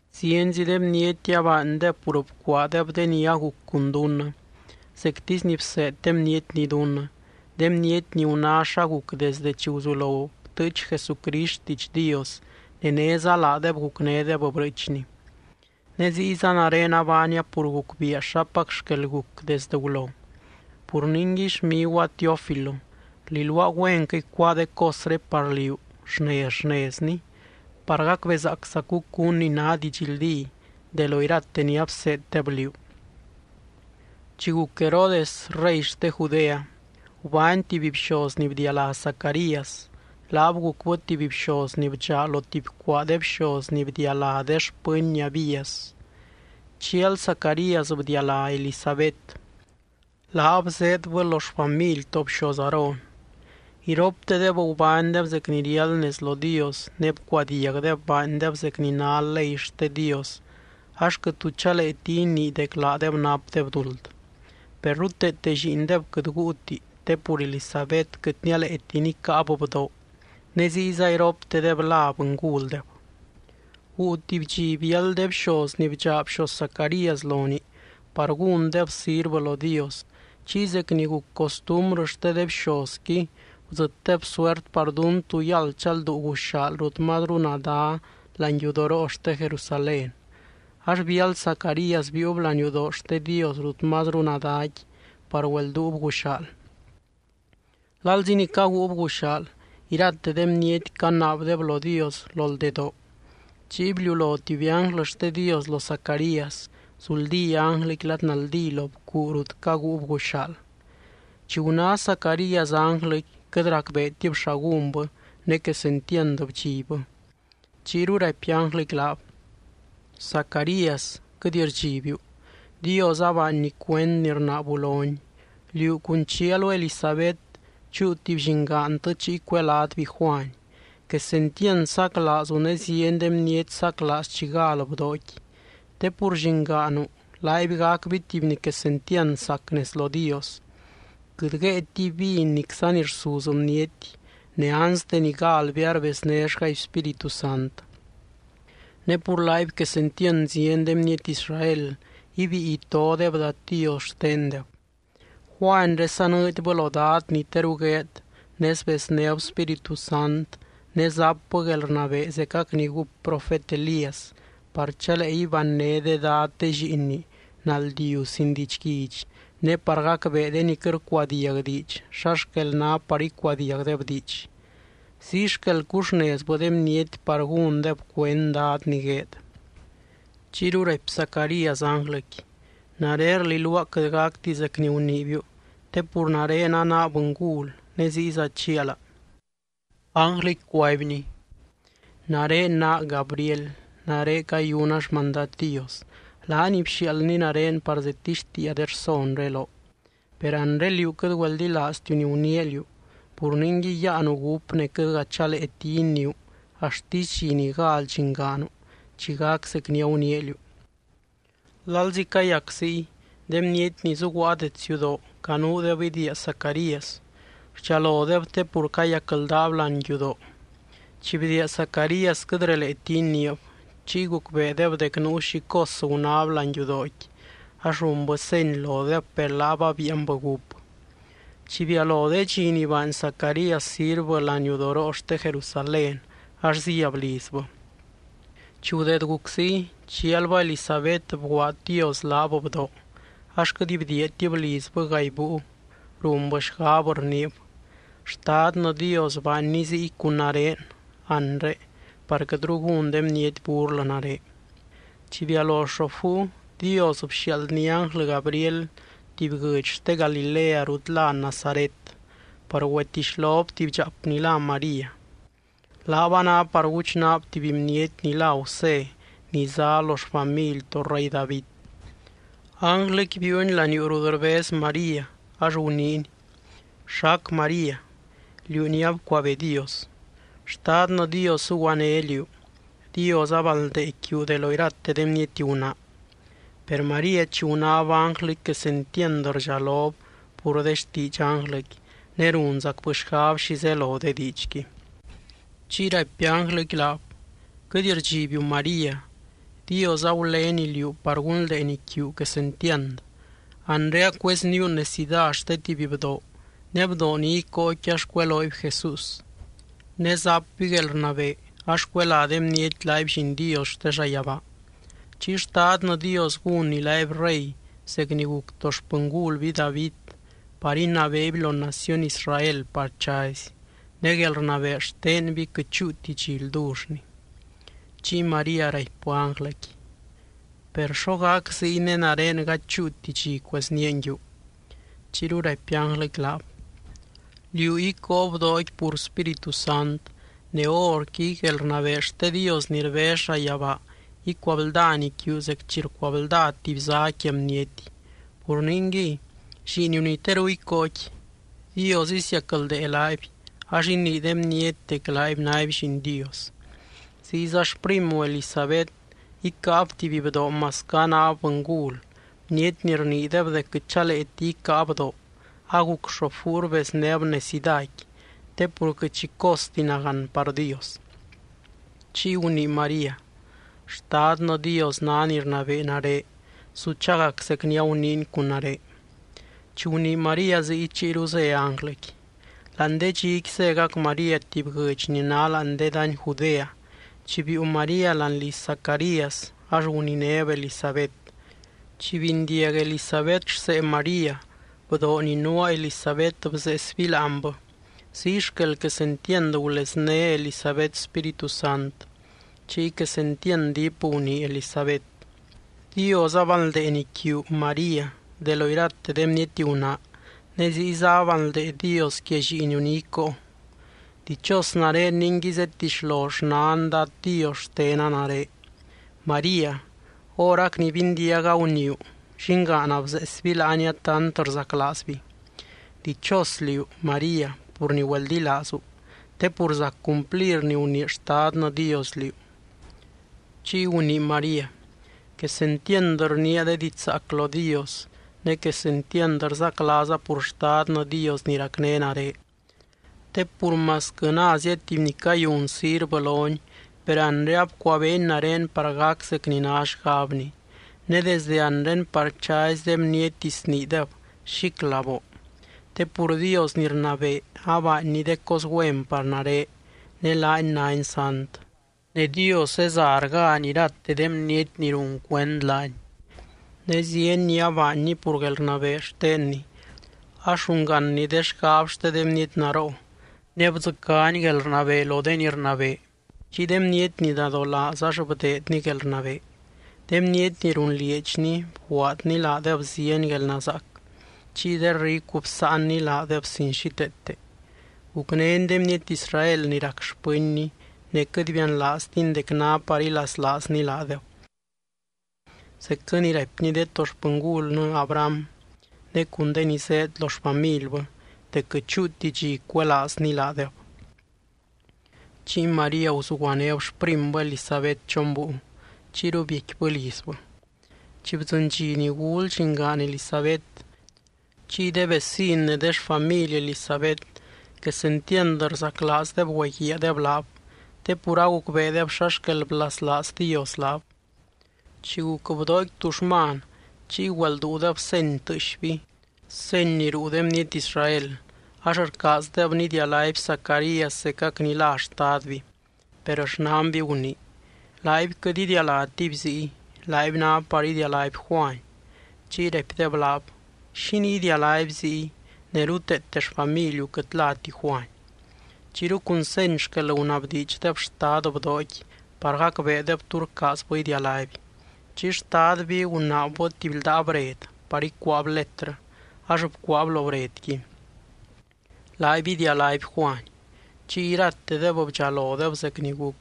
Zienzi de bniety abaandeb pur bcuaadeb de ni aguc cun dunnɨ, zectisy ni bseed de bnietni dunnɨ. De bniety ni guná xa guc desde chi guzulo btɨɨch Jesucrist xtiidx Dios ne néza laadeb gucnédeb brɨɨchni. Ne ziyza nare abaania pur gucbiia xapac xquel guc desdɨ gulo. Pur ningui, xmiguaa Teófilo, rliluaa güenquɨ icuáa de cosré par liú, xnez xnezni, par gacbezaaczacu cún ni ná didxldí de lo irate ni abseeddeb liú. Chi guc Herodes rey xte Judea, gubány tuby bxoz ni bdialá Zacarías. Laab gucbɨ tuby bxoz ni bdxaa lo tuby cuaa de bxoz ni bdialá de xpɨny Abías. Chial Zacarías bdialá Elisabet. Laab zéedbɨ lo xfamily to bxoz Aarón. Iroptedeb gubánydeb zec ni riáld nez lo Dios ne bcuadiagdeb baandeb zec ni ná ley xte Dios ax quɨt tu chaleeti inii dec laadeb napdeb duld. Per ruteete lliindeb quɨt guuti te pur Elisabet quɨt nialeeti nicáab bdoo ne ziyza iroptedeb la bɨnguldeb. Guu tuby dxi biáld de bxoz ni bdxaa bxoz Zacarías lonii par gúndeb sirvɨ lo Dios. Chiy zec ni guc costumbrɨ xte de bxozqui gudzɨtdeb suert par dún tú yáld chalduu guxaal rut mazru nadá láani yudoroo xte Jerusalén, ax biáld Zacarías biiub láani yudoo xte Dios rut mazru nadáqui par güelduub guxaal. Lalzi ni caguub guxaal, irate de bniety canaabdeb lo Dios lo ldedoo. Chiy bliulo tuby ánglɨ xte Dios lo Zacarías, zuldí ánglɨqui lad naldí lo bcuu rut caguub guxaal. Chi guná Zacarías ánglɨqui, quɨt racbeetib xa gúnbɨ ne quesentiand bdxibbɨ. Chiyru raipy ánglɨqui laab: —Zacarías, quɨt rdxibiu. Dios abaanny cuend ni rnaabu lony. Liú cun chialu Elisabet chúu tuby llingaantɨ chiy cuelátby Juany. Quesentiand saclaazu ne zieny de bniety saclaaz chi gal bdooqui. Te pur llingaanu laaby gacby tuby ni quesentiand sac nez lo Dios. Quɨt guéetiby vin nicza ni rsuz bniety, ne anste ni galby arbeznéxgaby Spíritu Sant. Ne pur laaby quesentiand zieny de bniety Israel ibíi itodeb Dad Dios xtendeb. Juanyré sanɨɨdybɨ lo Dad ni teru gueed ne sbeznéb Spíritu Sant ne zapbɨ guelrnabee zecac ni gúp profet Elías, par chalee ibanyné de dad de lliinni naldiu sin didxguidx ne par gacbee de ni quɨt rcuadiag diidx xa xquel ná par icuadiagdeb diidx. Ziy xquel cuxnezbɨ de bniety par gúndeb cuend Dad ni gueed. Chiyru raipy Zacarías ánglɨqui: —Nare rliluaa quɨt gacti zec ni guniibiu te pur nare anaa bɨngul ne ziyza chiala. Ánglɨqui cuaibny: —Nare naa Gabriel. Nare cayuna xmandad Dios. Laany bxiaaldny nare par zedtixtiia de rsonré loo. Per anre, liú quɨt güeldilaaztiu ni guniia liú. Pur ningui yáanu gúp ne quɨtga chaleeti iniiu axtisy dxi ni gal llingaanu chi gac zec ni aguniia liú. Lalzi cayac ziy, de bniety ni zuguaa dets yudoo canuudeb idiia Zacarías. Rdxalodeb te pur cayacldaab láani yudoo. Chi bdiia Zacarías, quɨt releeti iniib. Chiy gucbeedeb dec nuu xi cos gunáb láani yudooqui, ax runbɨ seny lodeb, per laab abíianbɨ gúp. Chi bialo de dxi ni baany Zacarías sirvɨ láani yudoroo xte Jerusalén ax zíab lizbɨ. Chi gudeed guc ziy, chialbɨ Elisabet bguaad Dios laab bdoo, ax quɨt bdiiatib lizbɨ gaay búiu. Runbɨ xgab rniib: “Xtadnɨ Dios baanny ziy cun nare anre par quɨtru gún de bniety burlɨ nare.” Chi bialo xoop búiu, Dios bxiaaldny ánglɨ Gabriel tuby guɨdx xte Galilea rut lá Nazaret par güetixlob tuby dxaap ni lá María. Laab a ná par guchnaab tuby bniety ni lá Gusé ni zá lo xfamily to rey David. Ánglɨqui biiuny laniuu rut rbez María ax guniiny: —¿Xac María?, liú ni abcuabee Dios. Xtadnɨ Dios zuguané liú. Dios abanldee quiu de lo irate de bniety gunaa. Per María chi gunáb ánglɨqui quesentiand rdxalob pur de xtiidx ánglɨqui ne runzacbɨ xgab xi zelo de diidxqui. Chiy raipy ánglɨqui laab: —Quɨt rdxibiu María. Dios agulény liú par gunldeeny quiu quesentiand. Anre acuezníu necidá xte tuby bdoo ne bdoo ni icóoqui ax cuelooby JESÚS. Ne zapby guelrnabee ax cuelá de bniety laaby Lliin Dios xte llayabaa. Chiy Xtadnɨ Dios gúnny laaby rey zec ni guc to xpɨngulby David par inabeeby lo naciony Israel par chazy. Ne guelrnabee xtenby quɨt chúuti dxi ldullni. Chiy María raipbɨ ánglɨqui: —Per, ¿xo gac ziy ne nare gady chúuti dxi cueznía nguiu? Chiyru raipy ánglɨqui laab: —Liú icóo bdooqui pur Spíritu Sant ne horqui guelrnabee xte Dios ni rbez llayabaa icuabldany quiu zec chi rcuablda tuby zá quia bniety. Pur ningui, lliiniu ni teru icóoqui, Dios isiacldee laaby ax inii de bniety dec laaby náby Lliin Dios. Ziyza xprimu Elisabet icáab tuby bdoo masquɨ anáb bɨngul. Bniety ni rniideb dec quɨt chaleeti icáa bdoo, aguc xoop búiu rbezbɨ necidáqui. Te pur quɨt xi costi nagán par Dios. Chiy gunii María: —Xtadnɨ Dios ná ni rnabee nare. Su chagac zec ni aguniiny cun nare. Chi gunii María ziy, chiyru zé ánglɨqui. Láani de dxiqui zégac María tuby guɨdx ni ná láani de dany Judea. Chi biiu María láani liz Zacarías ax guninéb Elisabet. Chi bindiag Elisabet rsee María, bdoo ni nuaa Elisabet bzeesby láanbɨ, ziy xquel quesentiand gulezné Elisabet Spíritu Sant. Chiy quesentiand diip gunii Elisabet: —Dios abanldeeny quiu, María, de lo irate de bniety gunaa ne ziyza abanldee Dios quia lliiniu ni icóo. ¡Dichos nare ningui zedtixlo xnan Dad Dios xtena nare! María, horac ni bindiaga guniiu, llingaana bzeesby láania tant rzaclaazby. Dichos liú, María, pur ni güeldilaazu, te pur zac cumplir ni gunii Xtadnɨ Dios liú. Chiy gunii María: Quesentiand rniia de diidx zaac lo Dios ne quesentiand rzaclaaza pur Xtadnɨ Dios ni racné nare. Te pur masquɨ názia tuby ni cayun sirvɨ lony, per anre abcuabeeny nare par gac zec ni ná xgabny, ne desde anre par chazy de bniety sniideb xíclaboo. Te pur Dios ni rnabee abaanny de cos güen par nare, ne laany nány sant. Ne Dios zeza rgány irate de bniety ni run cuend laany, ne zieny ni abaanny pur guelrnabee xtenny ax rungánny de xgab xte de bniety naroo. Ne bdzɨcány guelrnabee lo de ni rnabee. Chiy de bniety ni nadolaaz ax bdeedny guelrnabee. De bniety ni runlieedxni bguaadny laadeb zieny guelnazaac. Chiy de ricu bsáanny laadeb sin xíteete. Gucnény de bniety Israel ni rac xpɨnny ne quɨt bianlaaztiny dec ná par ilaslaazny laadeb. Zecquɨ ni raipny de to xpɨngulnɨ, Abraham, ne cun de ni zéed lo xfamilbɨ dec quɨt chúuti dxi cuelaazny laadeb. Chiy María guzuguanéb xprimbɨ Elisabet chon búiu, chiyru biecquibɨ lizbɨ. Chi bdzɨny dxi ni gul llingaan Elisabet, chiy de vecin ne de xfamily Elisabet quesentiand rzaclaazdeb güeguiaadeb laab, te pur agucbeedeb xa xquel blaslaaz Dios laab. Chi guc bdooqui tuxman, chiy güelduudeb seny tɨɨxby, seny ni ruu de bniety Israel, ax rcaazdeb nidialáby Zacarías zecac ni lá xtadby. Per xnanby gunii: —Laaby quɨt idialátiby ziy. Laaby ná par idialáby Juany. Chiy raipdeb laab: —¿Xínii idialáby ziy ne ruteete xfamiliu quɨt láti Juany? Chiyru cun seny xquel gunabdiidxdeb xtad bdooqui par gacbeedeb tú rcaazbɨ idialáby. Chiy xtadby gunaabbɨ tuby ldaa bred par ícuaab letrɨ, ax bcuaab lo bredqui: “Laaby idialáby Juany.” Chiy iratedeb bdxalodeb zec ni guc.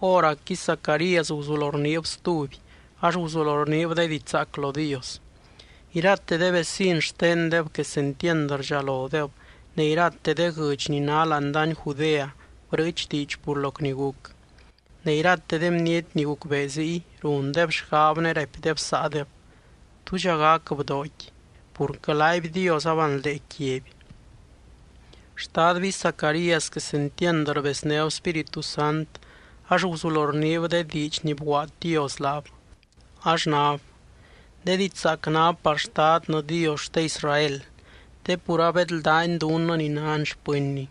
Hóracqui Zacarías guzulo rniib stuby ax guzulo rniib de diidx zaac lo Dios. Irate de vecin xtendeb quesentiand rdxalodeb, ne irate de guɨdx ni ná láani dany Judea brɨɨch diidx pur loc ni guc. Ne irate de bniety ni gucbee ziy, rundeb xgab ne raipdeb saadeb: —¿Túdxa gac bdooqui? Purquɨ laaby Dios abanldee quiaby. Xtadby Zacarías quesentiand rbeznéb Spíritu Sant ax guzulo rniib de diidx ni bguaad Dios laab, ax nab: De diidx zaac ná par Xtadnɨ Dios xte Israel te pur abedldány dunnɨ ni nan xpɨnny.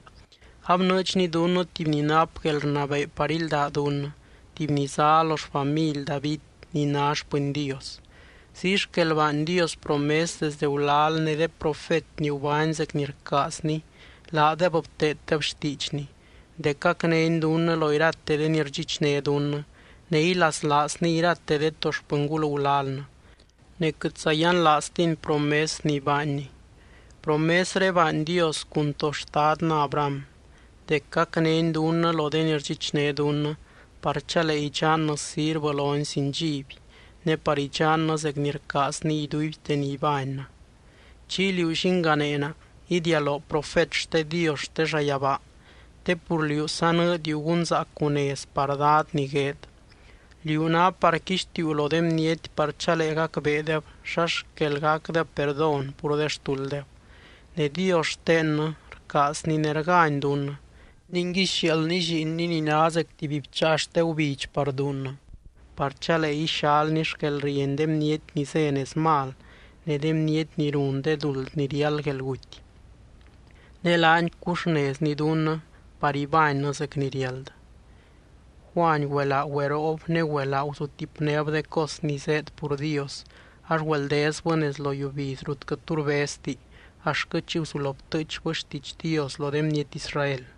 Abnɨɨdxny dunnɨ tuby ni nap guelrnabee par ílda dunnɨ, tuby ni zá lo xfamily David ni ná xpɨny Dios. Ziy xquel baany Dios promes desdɨ gulal ne de profet ni gubány zec ni rcaazny laadeb bteeddeb xtiidxny, dec gacnény dunnɨ lo irate de ni rdxichné dunnɨ, ne ilaslaazny irate de to xpɨngul gulalnɨ, ne quɨtza yianlaaztiny promes ni baanny. Promesré baany Dios cun to xtadnɨ Abraham dec gacnény dunnɨ lo de ni rdxichné dunnɨ par chalee idxannɨ sirvɨ lony sin dxiby, ne par idxannɨ zec ni rcaazny iduibte ni ibánnɨ. Chiy, liú, llinganeena, idialoo profet xte Dios xte llayabaa te pur liú sanɨɨdiu gunzaacu nez par Dad ni gueed. Liú ná par quixtiuu lo de bniety par chalee gacbeedeb xa xquel gacdeb perdón pur de xtulddeb. Ne Dios xtennɨ rcaazny ne rgány dunnɨ. Ningui sxiaaldny lliinny ni ná zec tuby bcháa xte gubidx par dunnɨ, par chalee ixalny xquelrieny de bniety ni zé nez mal ne de bniety ni run de duld ni riáld guelguty. Ne laany cuxnezny dunnɨ par ibánnɨ zec ni riáld. Juany güelaa güeroob ne güelaa guzutipnéb de cos ni zéed pur Dios, ax güeldezbɨ nez lo yiubiz rut quɨt tu rbezti axtquɨ chi guzulo btɨɨchbɨ xtiidx Dios lo de bniety Israel.